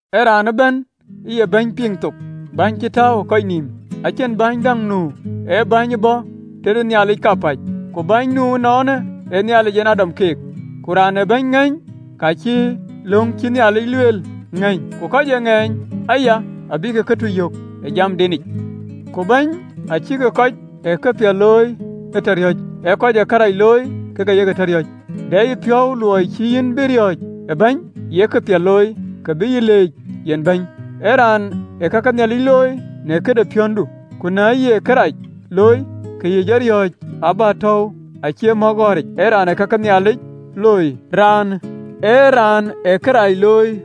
Ë raan ëbɛ̈n ë ye bäny piŋ thook, bäny cï tääu ë kɔc nïïm. Acïn bɛ̈ny däŋ nu, ee bäny ë bɔ̈ tëde Nhialic kapäc, ku bäny nu ënɔɔnë ee Nhialic yen ë dɔm keek. Ku raan ee bɛ̈ny ŋɛ̈ny, ka cï löŋ cïï Nhialic lueel ŋɛ̈ny, ku kɔc ee ŋeeny aya, abïk këtuc yök ë jamdenic. Ku bäny acïkï kɔc ee këpiɛth looi ee tɔ riɔ̈c, ee kɔc ee kërac looi kek aye ke tɔ riɔ̈c. De yïpiɔ̈u luɔi cïï yïn bï riɔ̈ɔ̈c ë bäny? Ye këpiɛth looi, ke bï yïn leec yen bɛ̈ny, ee raan ë ka ke Nhialic looi në këde piathdu. Ku na ye kërac looi, ke yï jɔ riɔ̈ɔ̈c, abätäu acie mɔ̈k ɣɔ̈ric, ee raan ë ka ke Nhialic looi, raan ë agönh ë Nhialic nyuöth kɔc ee kërac looi.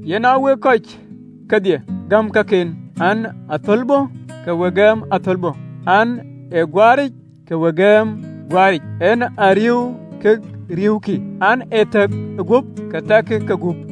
Yen a wek kɔc kedhie gäm kaken an, ee athölbö, ke we gɛm athölbö an, ee guaaric, ke we gɛm guaaric an, ee riëëu ke riëëukï an, ee thɛ̈k ë guöp, ke thɛkkï guöp.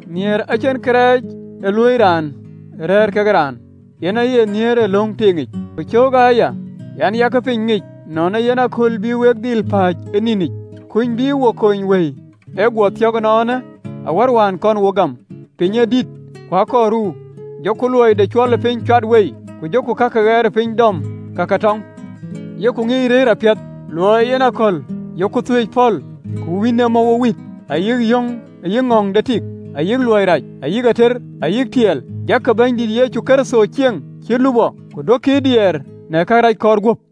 Nhialic acïn kërɛɛc ee luöi raan rɛ̈ɛ̈r ke raan, yen aye nhiëër löŋ tiiŋic. Ku cöökë aya an, “Yak piny ŋic, nɔn ee yen akööl bï wok dhil pääc ë nïnic, kuny bï wo kony wëi ë guɔ thiɔ̈k ënɔɔnë awär wään kɔn wok gam. Piny ë dït, ku a kɔɔr ruu, jɔku luɔi de cuɔlëpiny cuat wei, ku jɔku ka ke ɣɛɛrëpiny dɔm, ka ke tɔŋ. Yok ŋiëc rëër apiɛth, luɔi ee yen aköl, yok thuëëc pɔ̈l, ku wïn ee mɔ̈u wo wit, ayï ŋɔ̈ɔ̈ŋ de tik ayï luɔi rac, ayï ater ayï tiɛɛl. Jakkï Bɛ̈nydït Yecu Kërtho cieŋ cït lupɔ, ku duökï ee diɛɛr në karɛc kɔɔr guöp.